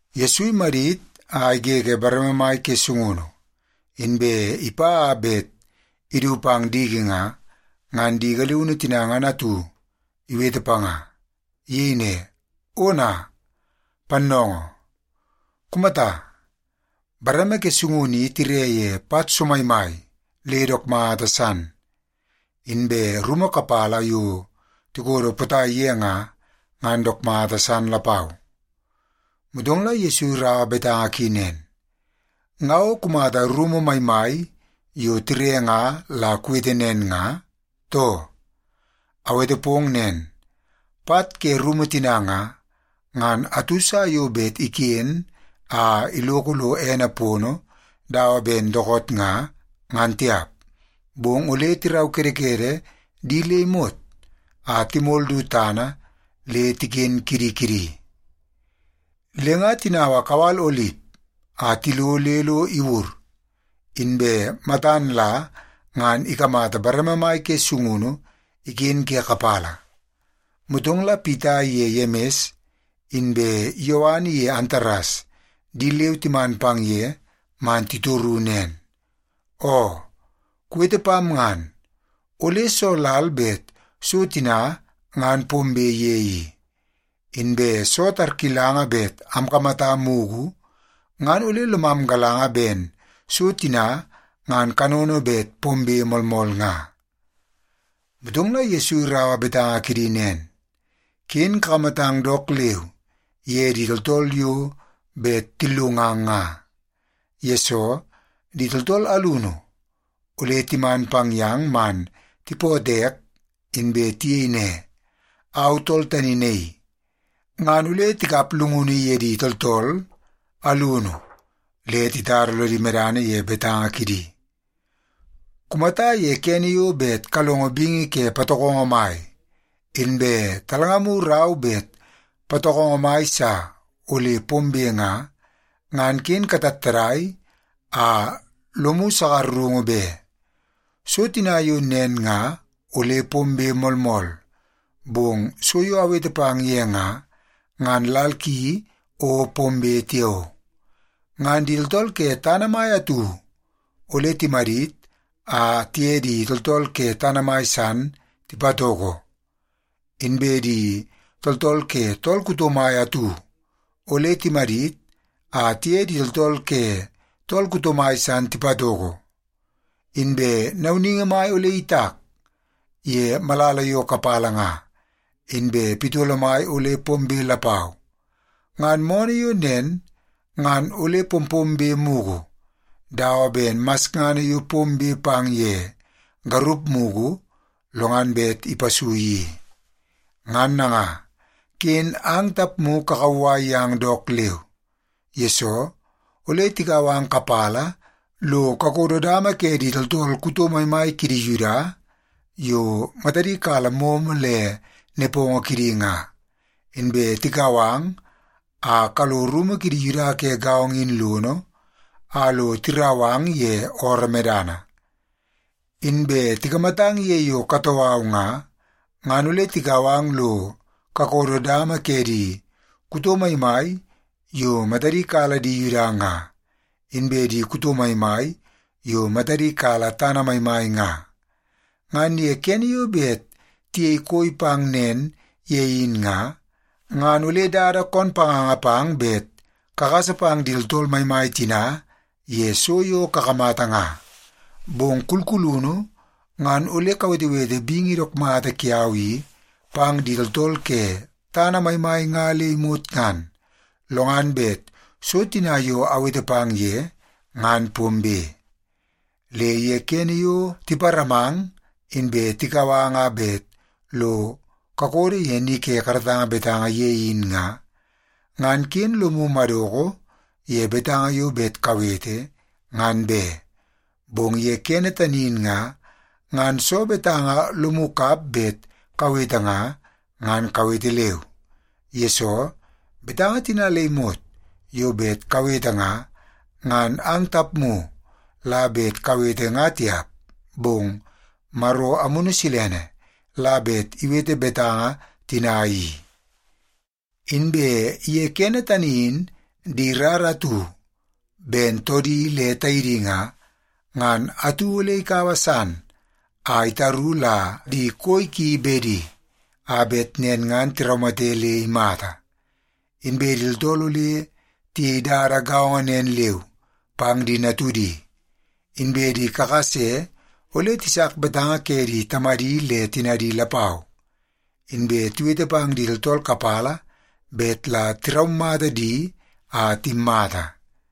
Yesu imadit a igege bareme mai ke sungunu, inbe ipa a bet idu pang diki nga, ngan di galiunu tina ngan atu iwete panga. Iyei ne, “Ona, Pannoongoo! Kumata, bareme ke sungunu i tire ye pat somaimai le dook mata san! Inbe rumu kapala yo tikodo potai ye nga, ngan dook mata san lapau.” Motong la Yesu iraua betanga ki nen, “Nga o kumata rumu maimai yo tire nga la kuwete nen nga, too? Awete pong nen, pat ke rumu tina nga, ngan atu sa yo bet iken a iloko lo ene pono dawa ben dookoot nga, ngan tiap. Bong ole tiraukedekede di le imot a timol du tana le tiken kidi kidi.” Le nga tinaua kawal Olip a tilo le lo iwur, inbe matan la ngan ikamata bareme mai ke sungunu iken ke kapala. Motong la Pita iye Yemis inbe Yowan iye Antares di leu timan pang ye man titoru nen, “Oo, kuwete pam ngan, ole soo lal bet so tina ngan pombe ye i? Inbe soo tarkilanga bet amkamata mugu, ngan ole lomam galanga ben so tina ngan kanono bet pombe moolmool nga?” Motong la Yesu iraua betanga kidi nen, “Ken kakamatang dook leu ye di tooltool yo bet tillungang nga. Yesoo, di tooltool alunu ole timan pang yang man tipootoo ek inbe tiyei ne, ‘Au tool tani naii.’ Ngan ole tikap llungunu ye di tooltool alunu le titara lodi medana ye betanga kidi. Kumata ye kene yo bet kalongo bingi ke patokongo mai, inbe talngamu rau bet patokongo mai sa ole pombe nga, ngan ken katattadai a lomu sakarungu be. So tina yo nen nga ole pombe moolmool, bong so yo awete pang ye nga, ngan lal ki o pombe tiao. Ngan di tooltool ke tana mai atu ole timadit a tiye di tooltool ke tana mai san tipatoko. Inbe di tooltool ke tool kuto mai atu ole timadit a tiye di tooltool ke tool kuto mai san tipatoko. Inbe nauningi mai ole itak ye malala yo kapala nga, inbe pitolo mai ole pombe lapau. Ngan moonoo yo nen ngan ole pompombe mugu, dawa ben masngana yo pombe pang ye garup mugu, lo ngan bet ipasui i. “Ngan nanga, ken ang tapmu kakauwai yang dook leu. Yesoo, ole tikau ang kapala lo kakodo dama ke di tooltool kuto maimai kidi Yuda yo matadi kala momo le nepongo kidi nga, inbe tikau ang a kalo rumu kidi Yuda ke gaongo in lono a lo tirau ang ye ooroo medana. Inbe tikamatang ye yo katoo au nga, ngan ole tikau ang lo kakodo dama ke di kuto maimai yo matadi kala di Yuda nga, inbe di kuto maimai yo matadi kala tana maimai nga. Ngan ye kene yo bet tiyei koi pang nen ye in nga, ngan ole dada koon panganga pang bet kagasa pang di tooltool maimai tina ye so yo kakamata nga. Bong kulkulunu ngan ole kawetewete bingi dook mata kiau i pang di tooltool ke tana maimai nga le imot ngan, lo ngan bet so tina yo awete pang ye ngan pombe. Le ye kene yo tiparamang inbe tikau ang a bet lo kakodo ye ni ke karatanga betanga ye in nga, ngan ken lomu madoko ye betanga yo bet kawete, ngan be. Bong ye kene tani in nga, ngan soo betanga lomu kap bet kawete nga, ngan kawete leu. Yesoo, betanga tina le imot yo bet kawete nga, ngan ang tapmu la bet kawete nga tiap, bong Maro Amunu Silene la bet iwete betanga tina i. “Inbe ye kene tani in di rara atu ben toodi le taidi nga, ngan atu ole ikaua san a itaru la di koi ki bedi, a bet nen ngan tiraumate le imata. Inbe di tooltool ole tiyei dada gaongo nen leu pang di natudi. Inbe di kakase ole tisak betanga ke di tamadi le tinadi lapau, inbe tiwete pang di tooltool kapala bet la tiraumata di a timmata.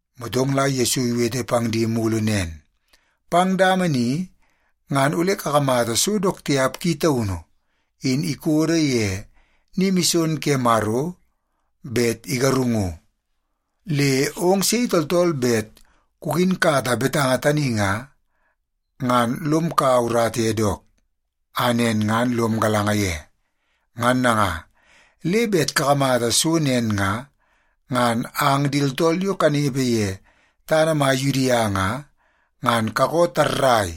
Motong la Yesu iwete pang di mulu nen, “Pang dama ni ngan ole kakamata so dook tiap ki taunu in ikodo ye ni mison ke Maro bet igarungu. Le ong sei tooltool bet kukinkata betanga tani nga, ngan lom kaua urata ye dook, a nen ngan lom galanga ye. Ngan nanga, le bet kakamata so nen nga, ngan ang di tooltool yo kanepe ye tana mai Yudia nga, ngan kakoo tarrai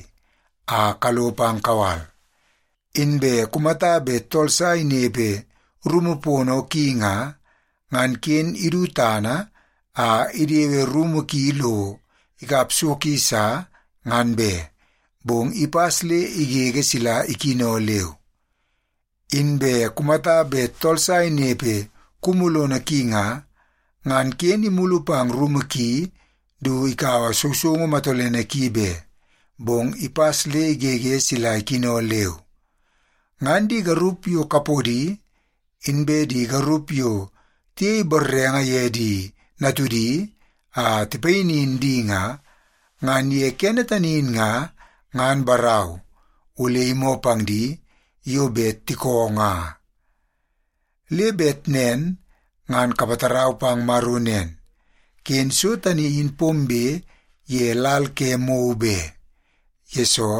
a kalo pang kawal. Inbe kumata bet tool sa inepe rumu pono ki nga, ngan ken idu tana a idewe rumu ki lo ikap so ki sa, ngan be, bong ipas le igege sila ikino leu. Inbe kumata bet tool sa inepe kumu lono ki nga, ngan ken imulu pang rumu ki du ikaua sousoungu matolene ki be, bong ipas le igege sila ikino leu. Ngan di garup yo kapodi, inbe di garup yo tiyei borrenge ye di natudi a tipayinin di nga, ngan ye kene tani in nga, ngan barau, ole imoo pang di yo bet tikoo nga. Le bet nen ngan kapatarau pang Maro nen, ken so tani in pombe ye lal ke mou be. Yesoo,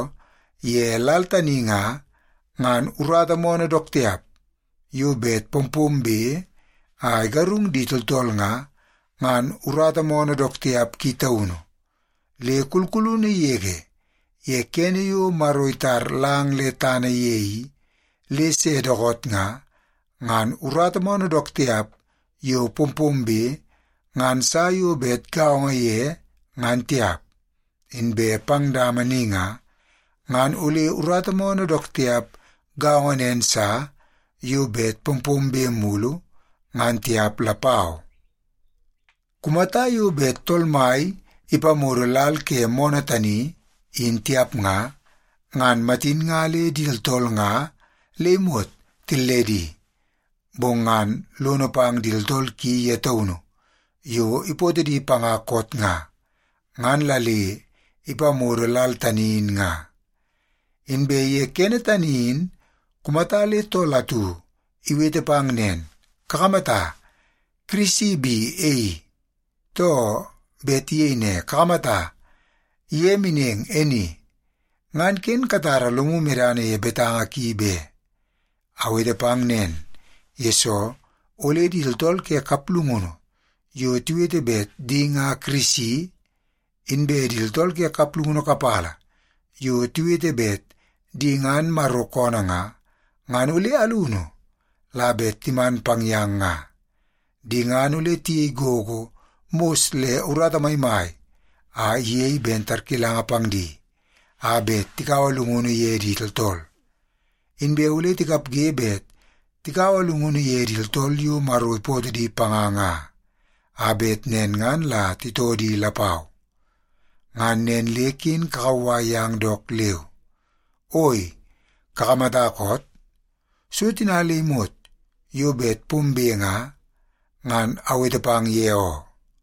ye lal tani nga, ngan urata moonoo dook tiap yo bet pompombe a igarung di tooltool nga, ngan urata moonoo dook tiap ki taunu. Le kulkulunu yege ye kene yo Maro itar lang le tana ye i, le se dookoot nga, ngan urata moonoo dook tiap yo pompombe ngan sa yo bet gaongo ye ngan tiap. Inbe pang dama ni nga, ngan ole urata moonoo dook tiap gaongo nen sa yo bet pompombe mulu, ngan tiap lapau. Kumata yo bet Tool Mai ipamodo lal ke moonoo tani in tiap nga, ngan matin nga le di tooltool nga le imot tilledi. Bong ngan lono pang di tooltool ki ye taunu yo ipootoo di panga koot nga, ngan la le ipamodo lal tani in nga. “Inbe ye kene tani in kumata le tool atu iwete pang nen, ‘Kakamata, Kirisi bi e i!’ too, bet iyei ne, ‘Kakamata, ye meneng e ni!’ ngan ken katara lomu medana ye betanga ki be. Awete pang nen, yesoo ole di tooltool ke kaplungunu yo tiwete bet di nga Kirisi, inbe di tooltool ke kaplungunu kapala yo tiwete bet di ngan Maro koonoo nga, ngan ole alunu la bet timan pang yang nga. Di ngan ole tiyei gogo mos le urata maimai a iyei ben tarkilanga pang di, a bet tikaua llungunu ye di tooltool. Inbe ole tikapge bet tikaua llungunu ye di tooltool yo Maro ipootoo di panga nga, a bet nen ngan la titoo di lapau. Ngan nen le ken kakauwai yang dook leu. Oi, kakamata koot? So tina le imot yo bet pombe nga, ngan awete pang ye oo.”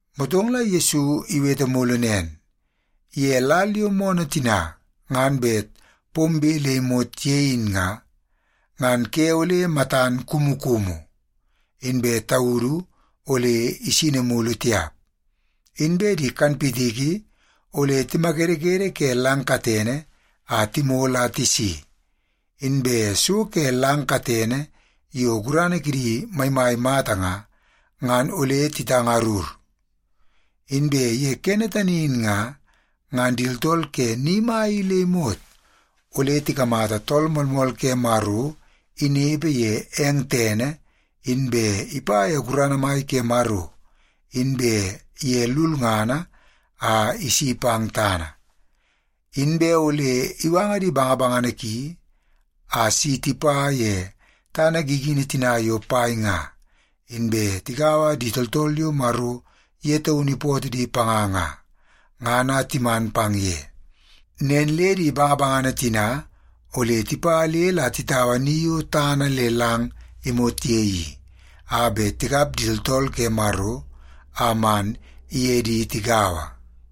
Motong la Yesu iwete mulu nen, “Ye lal yo moonoo tina ngan bet pombe le imot ye in nga, ngan ‘ke ole matan kumukumu, inbe taudu ole isini mulu tiap. Inbe di kanpitiki ole timakedekede ke lang katene a timol a tisi, inbe so ke lang katene yo gurana kidi maimai mata nga, ngan ole titangarur.’ “Inbe ye kene tani in nga, ngan di tooltool ke ni mai i le imot ole tikamata Tool Moolmool ke Maro inepe ye eng tene, inbe ipa ye gurana mai ke Maro inbe ye lulngana a isi pang tana. Inbe ole iwanga di bangabangana ki a si tipa ye tana gigini tina yo pai nga, inbe tigaua di tooltool yo Maro ye taunu ipootoo di panga nga, ngan a timan pang ye. Nen le di bangabangana tina ole tipa le la titaua ni yo tana le lang imot ye i, a bet tikap di tooltool ke Maro a man iye di tigaua.”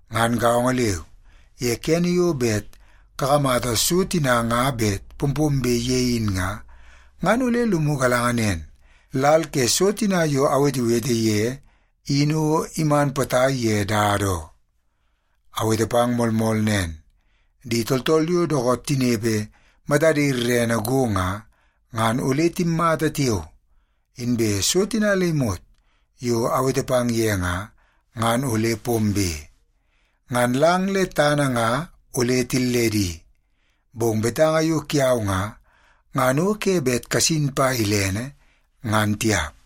Ngan gaongo leu, ye kene yo bet kakamata so tina nga bet pompombe ye in nga, ngan ole lomu galanga nen, lal ke so tina yo awetewete ye in o iman potai ye dada oo. Awete pang moolmool nen, di tooltool yo dookoot tinepe matadi rerene go nga, ngan ole timmata tiao, inbe so tina le imot yo awete pang ye nga, ngan ole pombe. Ngan lang le tana nga ole tilledi, bong betanga yo kiau nga, ngan o ke bet kasin pa ilene, ngan tiap.”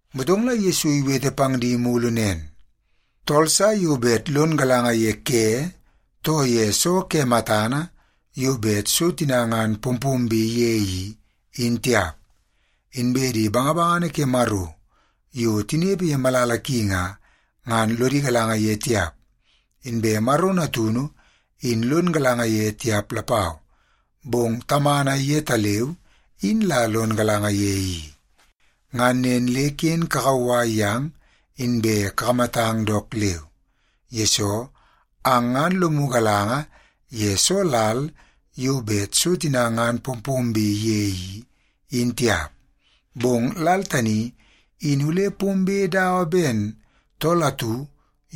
Motong la Yesu iwete pang di mulu nen, “Tool sa yo bet lon galanga ye ke, too ye soo ke matana yo bet so tina ngan pompombe ye i, in tiap. Inbe di bangabangana ke Maro yo tinepe ye malala ki nga, ngan lodi galanga ye tiap, inbe Maro Natunu in lon galanga ye tiap lapau, bong Tamana yetaleu in la lon galanga ye i. Ngan nen le ken kakauwai yang, inbe kakamatang dook leu. Yesoo, ang ngan lomu galanga ye soo lal yo bet so tina ngan pompombe ye i, in tiap. Bong lal tani in ole pombe dawa ben tool atu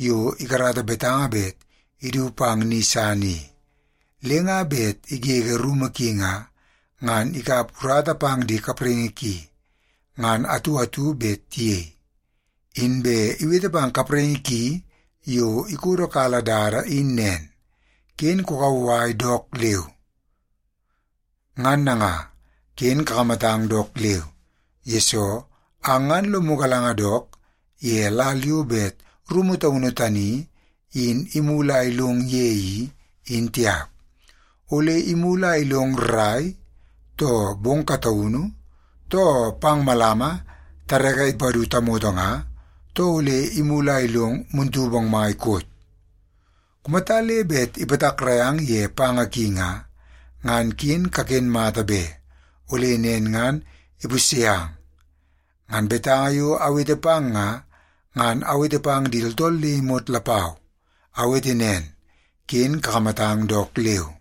yo ikarata betanga bet idu pang ni san i. Le nga bet igege rumu ki nga, ngan ikap urata pang di kapraingi ki ngan atu atu bet tiyei. Inbe iwete pang kapraingi ki yo ikodokala dada in nen, ‘Ken kukauwai dook leu.’ “Ngan nanga, ken kakamatang dook leu, yesoo ang ngan lomu galanga dook ye lal yo bet rumu taunu tani in imulu a ilong ye i, in tiap. Ole imulu a ilong rrai, too bong kataunu, too pang malama tareke ipadu tamoto nga, too ole imulu a ilong muntu bongmai koot? Kumata le bet ipatakrai ang ye panga ki nga, ngan ken kaken mata be, ole nen ngan ipusye ang. Ngan betanga yo awete pang nga, ngan awete pang di tooltool le imot lapau. Awete nen, ken kakamatang dook leu!”